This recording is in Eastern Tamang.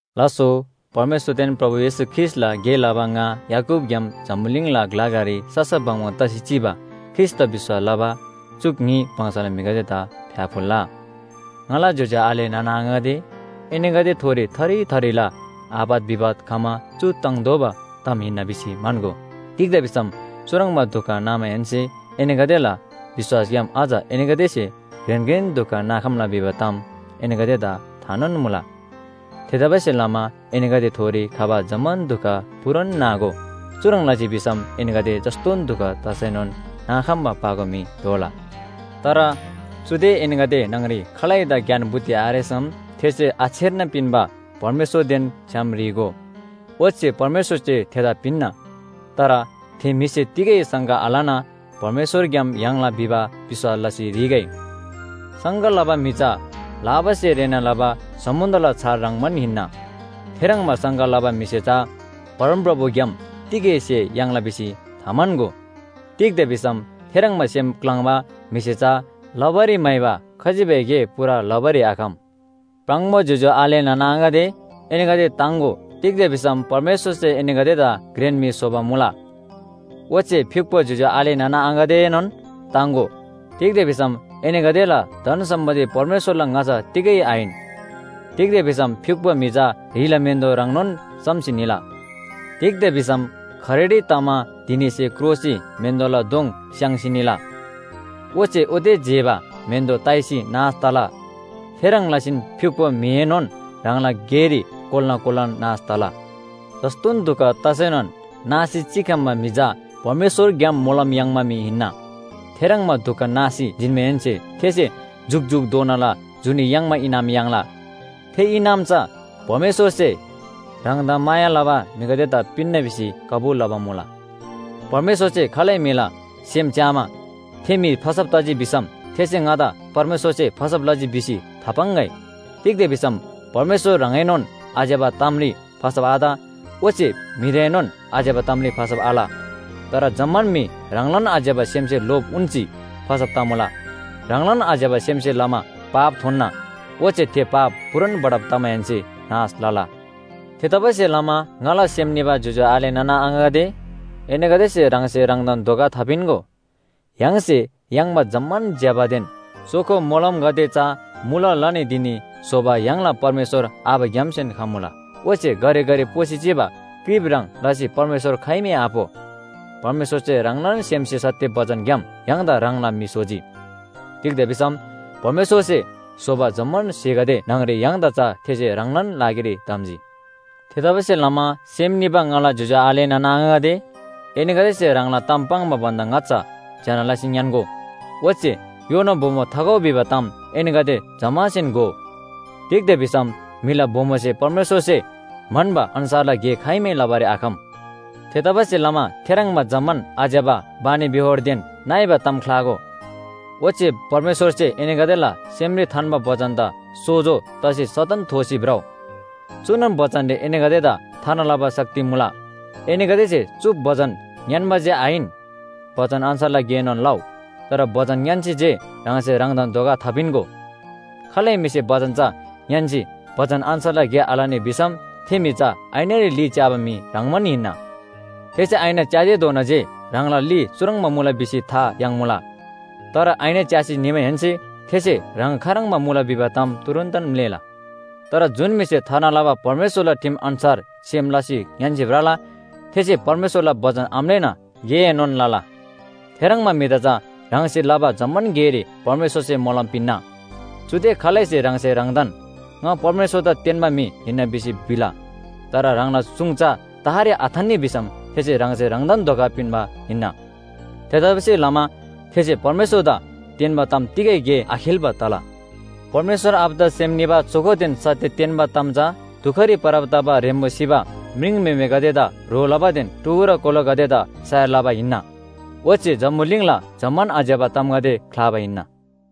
लास्‍सो, परमेश्‍वरदेन प्रभु येशू ख्रीष्‍टला गे लबा ङा याकूबग्‍याम जम्‍बुलिङला ग्‍ला ग्‍लारी ससा बङबङ तसी चिबा ख्रीष्‍टदा विश्‍वास लबा च्‍युक न्‍ही वंशला म्‍हिगदेदा फ्‍याफुल्‍ला। ङाला ज्‍योज्‍यो आले नाना आङागदे, एनीगदेथोरी थरी थरीला आपत विपत खमा चु ताङ्तोःबा ताम हिन्‍ना भिसी म्‍हन्‍गो। तिग्‍दा भिसम चुह्रङ्बा दुख नामाहेन्‍से एनीगदेला विश्‍वासग्‍याम अझ एनीगदेसे घ्रेन घ्रेन दुख नाखम्‍ला भिबा ताम एनीगदेदा थानोन मुला। थेतबासेलमा एनीगदेथोरी खबा जम्‍मान दुख पूरान नागो। चुह्रङ् लजी भिसम एनीगदे जस्‍तोन दुख तसैनोन नाखम्‍बा पाको म्‍हि दोला। तर चुदे एनीगदे न्‍हङरी खालैदा ज्ञान बुद्धि आरेसम थेसे आछेर्ना पिन्‍बा परमेश्‍वरदेन छ्‌याम ह्री‍गो। ओच्‍छे परमेश्‍वरसे थेदा पिन्‍ना। तर थे म्‍हिसे तिगै शङ्का आलना परमेश्‍वरग्‍याम याङ्ला भिबा विश्‍वास लसी ह्रीगै। शङ्का लबा म्‍हि चा लाबासे रेःना लबा समुन्‍द्रला छाल ह्रङ्‌बान हिन्‍ना। थेह्रङ्बा शङ्का लबा म्‍हिसे चा परमप्रभुग्‍याम तिगै स्‍हे याङ्ला भिसी थाम्‍हन्‍गो। तिग्‍दा भिसम थेह्रङ्बा सेम क्‍लाङ्बा म्‍हिसे चा लबारी म्‍हाइबा खजिबै गे पूरा लबारी आखम। प्राङबो ज्‍योज्‍यो आले नाना आङागदे, एनीगदे ताङ्‍गो। तिग्‍दा भिसम परमेश्‍वरसे एनीगदेदा घ्रेन म्‍हि स्‍होबा मुला। ओच्‍छे फ्‍युक्‍पो ज्‍योज्‍यो आले नाना आङागदेएनोन ताङ्‍गो, तिग्‍दा भिसम एनीगदेला धन सम्‍पत्ति परमेश्‍वरला ङाच्‍छा तिगै आहिन। तिग्‍दा भिसम फ्‍युक्‍पो म्‍हि चा ह्रिला म्‍हेन्‍दो ह्रङ्नोन सम्‍सी निला। तिग्‍दा भिसम खरेडी तमा धिनीसे क्रोसी म्‍हेन्‍दोला दोङ स्‍याङ्सी निला। ओच्‍छे ओते जेबा म्‍हेन्‍दो ताइसी नाश तला। थेह्रङ् लसीन फ्‍युक्‍पो म्‍हिएनोन ह्राङला गेरी कोल्‍ना कोल्‍नान नाश तला। जस्‍तोन दुख तसैनोन नासी चिखम्‍बा म्‍हि चा परमेश्‍वरग्‍याम मोलम याङ्बा म्‍हि हिन्‍ना। थेह्रङ्बा दुख नासी जिन्‍माहेन्‍से थेसे जुकजुकधोनाला जुनी याङ्बा इनाम याङ्ला। थे इनाम चा परमेश्‍वरसे ह्राङदा माया लबा म्‍हिगदेदा पिन्‍ना भिसी कबुल लबा मुला। परमेश्‍वरसे खालै म्‍हिला सेम च्‍यामा, थे म्‍हि फसब तजी भिसम थेसे ङादा परमेश्‍वरसे फसब लजी भिसी थापाङ्‍गै। तिग्‍दा भिसम परमेश्‍वर ह्राङएनोन आज्‍यबा तामरी फसब आत। ओच्‍छे म्‍हिदाएनोन आज्‍यबा तामरी फसब आल। तर जम्‍मान म्‍हि ह्राङलान आज्‍यबा सेमसे लोभ उन्‍सी फसब तमुला। ह्राङलान आज्‍यबा सेमसे लमा पाप थोन्‍ना। ओच्‍छे थे पाप पूरान बढब तमाहेन्‍से नाश लला। थेतबासेलमा ङाला सेम निबा ज्‍योज्‍यो आले नाना आङागदे, एनीगदेसे ह्राङसे ह्राङदान धोका थापिन्‍गो। य्‍हाङसे याङ्बा जम्‍मान ज्‍यबादेन चोखो मोलमगदे चा मुला लनी धिनी स्‍होबा य्‍हाङला परमेश्‍वर आबाग्‍यामसेन खमुला। ओच्‍छे घरिघरि पोसी चिबा क्रिप ह्रङ् लसी परमेश्‍वर खाइमै आपो। परमेश्‍वरसे ह्राङलान सेमसे सत्‍य बचनग्‍याम य्‍हाङदा ह्राङला म्‍हि स्‍होजी। तिग्‍दा भिसम परमेश्‍वरसे स्‍होबा जम्‍मान स्‍हेगदे न्‍हङरी य्‍हाङदा चा थेसे ह्राङलान लागिरी धम्‍जी। थेतबासेलमा सेम निबा ङाला ज्‍योज्‍यो आले नाना आङागदे, एनीगदेसे ह्राङला ताम पाङ्बा भन्‍दा ङाच्‍छा ज्‍यना लसी ङ्‌यान्‍गो। ओच्‍छे योना बोमो थाखउ भिबा ताम एनीगदे जम्‍मासेन घोउ। तिग्‍दा भिसम म्‍हिला बोमोसे परमेश्‍वरसे म्‍हन्‍बा अन्‍छारला गे खाइमै लबारी आखम। थेतबासेलमा थेह्रङ्बा जम्‍मान आज्‍यबा बानीबेहोरदेन नइबा ताम ख्‍लागो। ओच्‍छे परमेश्‍वरसे एनीगदेला सेमरी थान्‍बा बचनदा सोजो तसी सदन थोसी भ्रउ। चुनोन बचनरी एनीगदेदा थार्ना लबा शक्ति मुला। एनीगदेसे चु बचन ङ्‌यान्‍बा जे आहिन, बचन अन्‍छार गेएनोन लउ। तर बचन ङ्‌यान्‍सी जे ह्राङसे ह्राङदान धोका थापिन्‍गो। खालै म्‍हिसे बचन चा ङ्‌यान्‍सी बचन अन्‍छार गे आलनी भिसम थे म्‍हि चा ऐनारी ली च्‍याबा म्‍हि ह्रङ्‌बान हिन्‍ना। थेसे ऐना च्‍यातेधोना जे ह्राङला ली चुह्रङ्बा मुला भिसी था याङ्मुला। तर ऐना च्‍यासी निमाहेन्‍से थेसे ह्राङ खाह्रङ्बा मुला भिबा ताम तुरुन्‍तन म्‍लेःला। तर जुन म्‍हिसे थार्ना लबा परमेश्‍वरला ठिम अन्‍छार सेम लसी ङ्‌यान्‍सी भ्रला, थेसे परमेश्‍वरला बचन आम्‍लेःना गेएनोन लला। थेह्रङ्बा म्‍हिदा चा ह्राङसे लबा जम्‍मान गेरी परमेश्‍वरसे मोलम पिन्‍ना। चुदे खालैसे ह्राङसे ह्राङदान ङा परमेश्‍वरदा तेन्‍बा म्‍हि हिन्‍ना भिसी भिला, तर ह्राङला सुङ चा तहरी आथान्‍नी भिसम थेसे ह्राङसे ह्राङदान धोका पिन्‍बा हिन्‍ना। थेतबासेलमा थेसे परमेश्‍वरदा तेन्‍बा ताम तिगै गे आखेल्‍बा तला। परमेश्‍वर आबादा सेम निबा चोखोदेन सत्‍य तेन्‍बा ताम चा दुखरी परब तबा ह्रेम्‍बो सिबा म्रिङम्‍हेमेगदेदा ह्रो लबादेन टुहुरा कोलागदेदा सयार लबा ओच्‍छे जम्‍बुलिङला जम्‍मान आज्‍यबा तामगदे ख्‍लाबा हिन्‍ना।